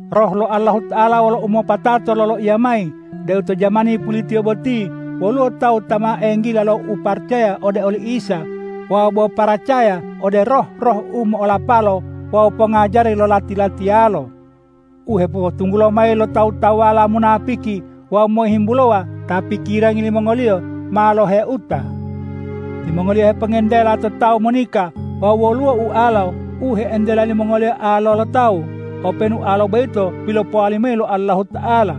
Roh lo Allahuta'ala wolo umopatato loloiya mayi deu to jamani pulitiyo boti woluwo tawu ta ma enggila lo uparacaya ode oli Isa wawu bo paracaya ode roh-roh u mo'olapalo wawu pongajari lo lati-latiyalo u hepopotunggulo mayi lo tawu-tawuwala munapiki wawu mohimbulowa ta pikirangi limongoliyo ma loheuta. Timongoliyo hepongentela to tawu monika wawu woluwo ualo u he'entela limongoliyo alo lo tawu, openu ualo boyito pilopowali mayi lo Allahuta'ala.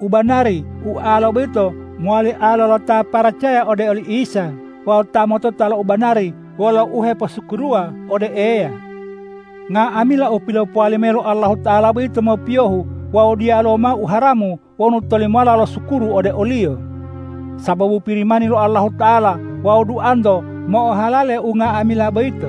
U banari ualo boyito mowali alo lo ta paracaya ode oli Isa wawu ta motota lo u banari wolo uheposukuruwa ode Eya. Nga'amila u pilopowali mayi lo Allahuta'ala boyito mopiyohu wawu diyaluwo mao u haramu wonu tolimola losukuru ode o-Liyo, sababu Pirimani lo Allahuta'ala wawu duanto mo'ohalale unga'amila boyito.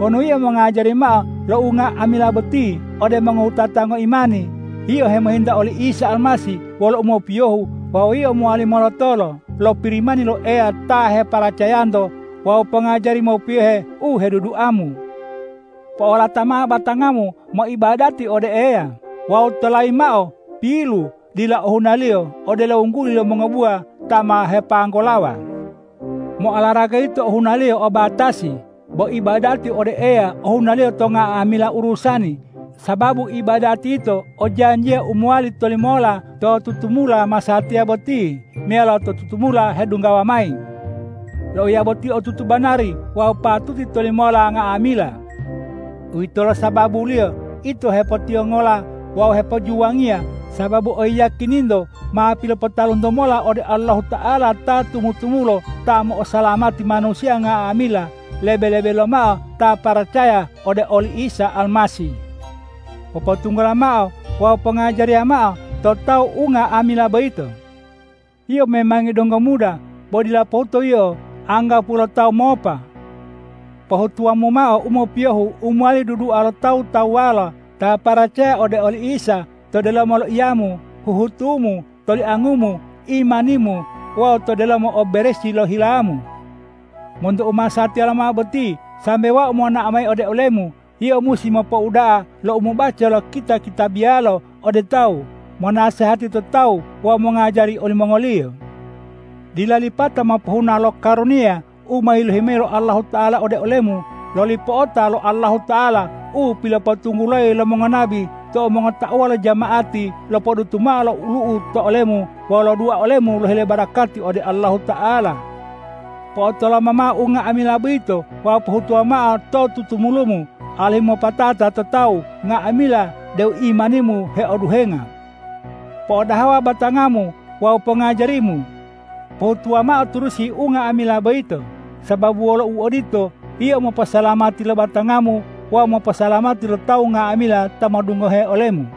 Wonu yio mongajari mao lo unga'amila boti ode mongowutata ngoimani, yio hemohinta oli Isa Almasih wolo umopiyohu wawu yio mowali molotolo lo Pirimani lo Eya ta heparacayanto wawu pongajari mopiyohe u heduduamu. Po'olata mao batangamu moibadati ode Eya wawu tolayimu mao pilu dila ohunaliyo, odelo wungguli lo mongobuwa ta ma hepanggolawa. Mo'olaraga yito hunaliyo o batasi, bo ibadati ode Eya ohunaliyo to nga'amila urusani, sababu ibadati yito o janjiya u mowali tolimola to tutumula masatiya boti meyalo to tutumula hedunggawa mayi. Loiya boti otutu banari wawu patuti tolimola nga'amila. Uwitolo sababuliyo ito hepotiwongola wawu hepojuwangiya, sababu oyiyakininto ma pilopotalunto mola ode Allahuta'ala ta tumu-tumulo ta mo'osalamati manusiya nga'amila, lebe-lebe lomao ta paracaya ode oli Isa Almasih. Popotunggula mao wawu pongajariya mao to tawu unga'amila boyito. Yio memangi donggo muda, bo dila pohuto yio anggapuwo lo tawu mopa. Pohutuwamu mao u mopiyohu u mowali dudua lo tawu-tawuwala ta paracaya ode oli Isa to delomo loiyamu, huhutumu, toliangumu, imanimu wawu to delomo o beresi lo hilamu. Monto u masatiya lomao boti sambe wau monao mayi ode olemu, yio musi mopouda'a lo umobaca lo kita-kitabiyalo ode tawu, monasehati to tawu wawu mongajari olimongoliyo. Dila lipata mopohuna lo karuniya u ma yilohi mayi lo Allahuta'ala ode olemu loli po'ota lo Allahuta'ala u pilopotunggulayi lo mongonabi tou mongotauwa lo jama'ati lopodutu mao lo olu'u to olemu wawu lodua olemu lohile barakati ode Allahuta'ala. Po'otoloma mao unga'amila boyito wawu pohutuwa mao to tutumulumu, alihu mopatata to tawu nga'amila deu imanimu heoduhenga. Po'odahawa batangamu wawu pongajarimu. Pohutuwa ma turusi unga'amila boyito; sababu wolo u odito yio moposalamati lo batangamu wawu moposalamati lo tawu nga'amila ta modungohe olemu.